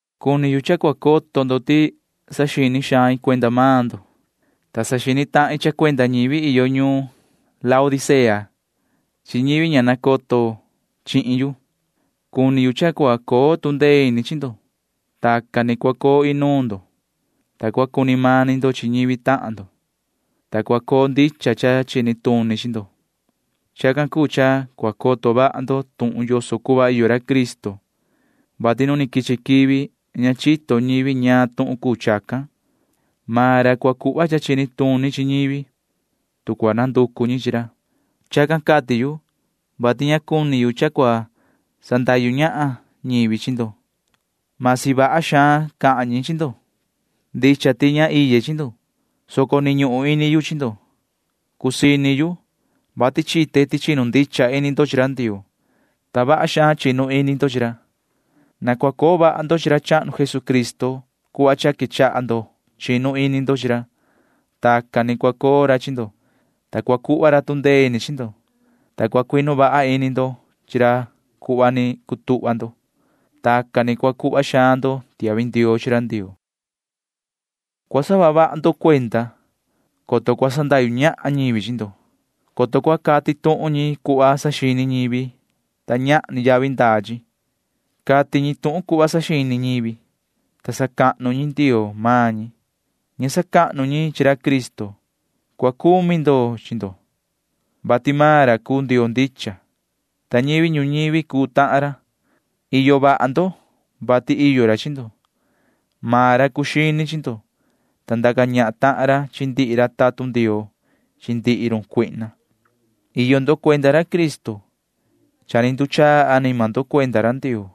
Cuni yu cha cua coto ndo ti saxini xain cuenda maan ndo, ta saxini tahin cha cuenda ñivi iyo ñuun Laodicea chi ñivi ña ta nacoto chihin yu. Cuni yu cha cua coo tu ndee ini chi ndo. Tacan ni cua coo inuun ndo, ta cua cuni mani ndo chi ñivi tahan ndo, ta cua coo ndicha cha chini tuni chi ndo. Chacan cuu cha cua coto vaha ndo tuhun yoso cuhva iyo ra Cristo, vati nu ni quichi quivi ña chito ñivi ñaan tuhun cuu chacan. Maan ra cua cuhva cha chini tuni chi ñivi, tu cua nanducu ñi chi ra. Chacan cati yu, vati ña cuni yu cha cua cuu sandahyu ñahan ñivi chi ndo―masi vaha xaan cahan ñi chi ndo. Ndicha ti ña iye chi ndo, soco ni ñuhun ini yu chi ndo. Cusii ini yu, vati chite ti chinu ndicha ini ndo chi ra Ndioo, ta vaha xaan chinu ini ndo chi ra. Na cua coo vaha ndo chi ra chahnu Jesucristo cuhva cha quechaha ndo chinu ini ndo chi ra. Tacan ni cua coo ra chi ndo, ta cua cuhva ra tu ndee ini chi ndo, ta cua cuinu vaha ini ndo chi ra cuhva ni cutuhva ndo. Tacan ni cua cuhva xaan ndo tiahvi ndioo chi ra Ndioo. Cua saha vaha ndo cuenda, coto cua sandahyu ñahan ñivi chi ndo, coto cua cati tuhun ñi cuhva saxini ñivi, ta ñahni yavi ndaa chi. Cati ñi tuhun cuhva saxini ñivi, ta sacahnu ñi ndioo maan ñi. Ña sacahnu ñi chi ra Cristo. Cua cumi ndo chi ndo, vati maan ra cuu Ndioo ndicha, ta ñivi ñuñivi cuu tahan ra. Iyo vaha ndo, vati iyo ra chi ndo. Maan ra cuu xini chi ndo, ta ndaca ñahan tahan ra chi ndihi ra tatun Ndioo chi ndihi run cuihna. Iyo ndo cuenda ra Cristo. Cha ni nduchaa anima ndo cuenda ra Ndioo,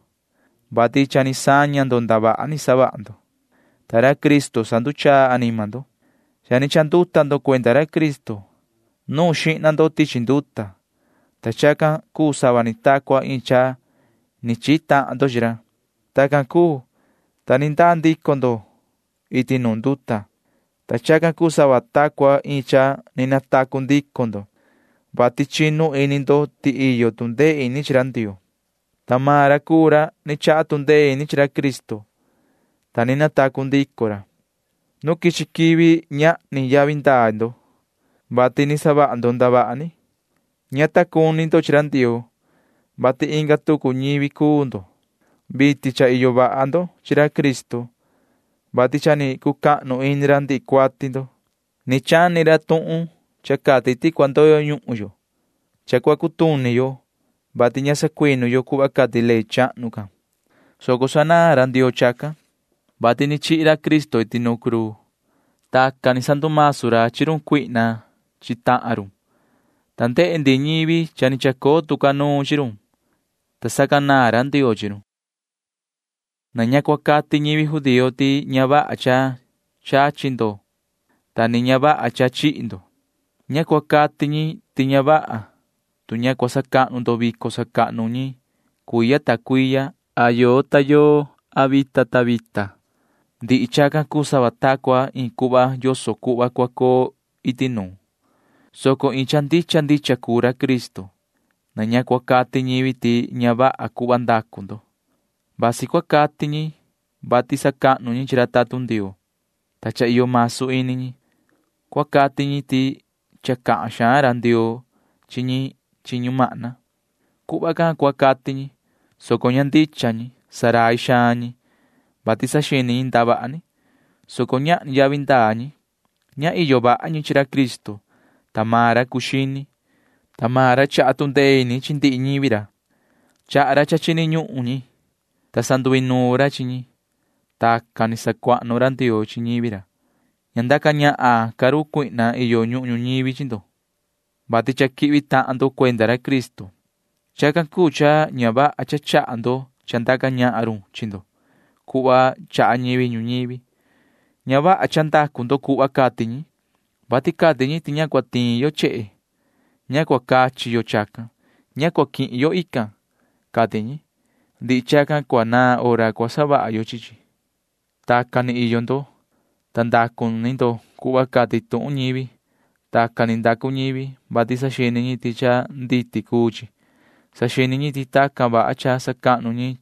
vati cha ni saña ndo ndavaha ni savaha ndo, ta ra Cristo sanduchaa anima ndo. Cha ni chanduta ndo cuenda ra Cristo. Nuun xihna ndo tichi nduta, ta chacan cuu sava ni ta cua iin cha ni chihi tahan ndo chi ra. Tacan cuu, ta ni ndaa ndico ndo iti nuun nduta, ta chacan cuu sava ta cua iin cha ni natacu ndico ndo, vati chinu ini ndo ti iyo tu ndee ini chi ra Ndioo, ta maan ra cuu ra ni chaha tu ndee ini chi ra Cristo, ta ni natacu ndico ra. Nu quichi quivi ñahni yavi ndaa ndo, vati ni savaha ndo ndavaha ni. Ña ta cuni ndo chi ra Ndioo, [vati inga tucu ñivi cuu ndo]. Vitin cha iyo vaha ndo chi ra Cristo, vati cha ni cucahnu ini ra ndihi cuati ndo. Ni chani ra tuhun cha cati ti cua ndoyo ñuhun yo. Cha cua cutuni yo, vati ña sacuinu yo cuhva cati ley chahnu can, soco sanaan ra Ndioo chacan, vati ni chihi ra Cristo iti nu cruu. Tacan ni sandumasu ra chi run cuihna chi tahan run, ta ndehe ndihi ñivi cha ni chacoo tu ca nuun chi run, ta sacanaan ra Ndioo chi run. Na ña cua cati ñivi judío ti ña vaha cha chachi ndo ta ni ña vaha cha chihi ndo. Ña cua cati ñi ti ña vaha tu ña cua sacahnu ndo vico sacahnu ñi cuiya ta cuiya a yoo ta yoo a vita ta vita. Ndihi chacan cuu sava ta cua iin cuhva yoso cuhva cua coo iti nuun, soco iin cha ndicha ndicha cuu ra Cristo. Na ña cua cuu cati ñivi ti ña vaha cuhva ndacu ndo. Vasi cua cati ñi vati sacahnu ñi chi ra tatun Ndioo, ta cha iyo masu ini ñi. Cua cati ñi ti cha cahan xaan ra Ndioo chi ñi chi ñumahna. Vasi chacan cua cahan ñi, soco ña chito ñi. Rai cuni ñi, vati saxini ñi ndavaha ni, soco ñahni yavi ndaa ñi. Ña iyo vaha ñi chi ra Cristo, ta maan ra cuu xini, ta maan ra chaha tu ndee ini chi ndihi ñivi ra. Chaha ra cha chini ñuhun ñi, ta sanduinuun ra chi ñi. Tacan ni sacuahnu ra Ndioo chi ñivi ra. Ña ndaca ñahan ca run cuihna iyo ñuhun ñuñivi chi ndo, vati cha quihvi tahan ndo cuenda ra Cristo. Chacan cuu cha ña vaha cha chaha ndo cha ndaca ñahan run chi ndo cuhva chaha ñivi ñuñivi. Ña vaha cha ndacu ndo cuhva cati ñi, vati cati ñi ti ña cua tiin yo chehe. Ña cua cachi yo chacan. Ña cua quihin yo inga, cati ñi. Ndihi chacan cua naan hora cua savaha yo chi chi. Tacan ni iyo ndo, ta ndacu ni ndo cuhva cati tuhun ñivi. Tacan ni ndacu ñivi, vati saxini ñi ti cha nditi cuu chi. Saxini ñi ti tacan vaha cha sacahnu ñi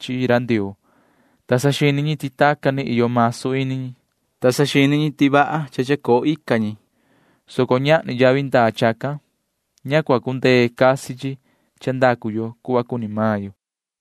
chi Ndioo, ta saxini ñi ti tacan ni iyo masu ini ñi, ta saxini ñi ti vaha cha chacoo ica ñi, soco ñahni yavi ndaa chacan. Ña cua cundee casi chi cha ndacu yo cuhva cuni maan yo.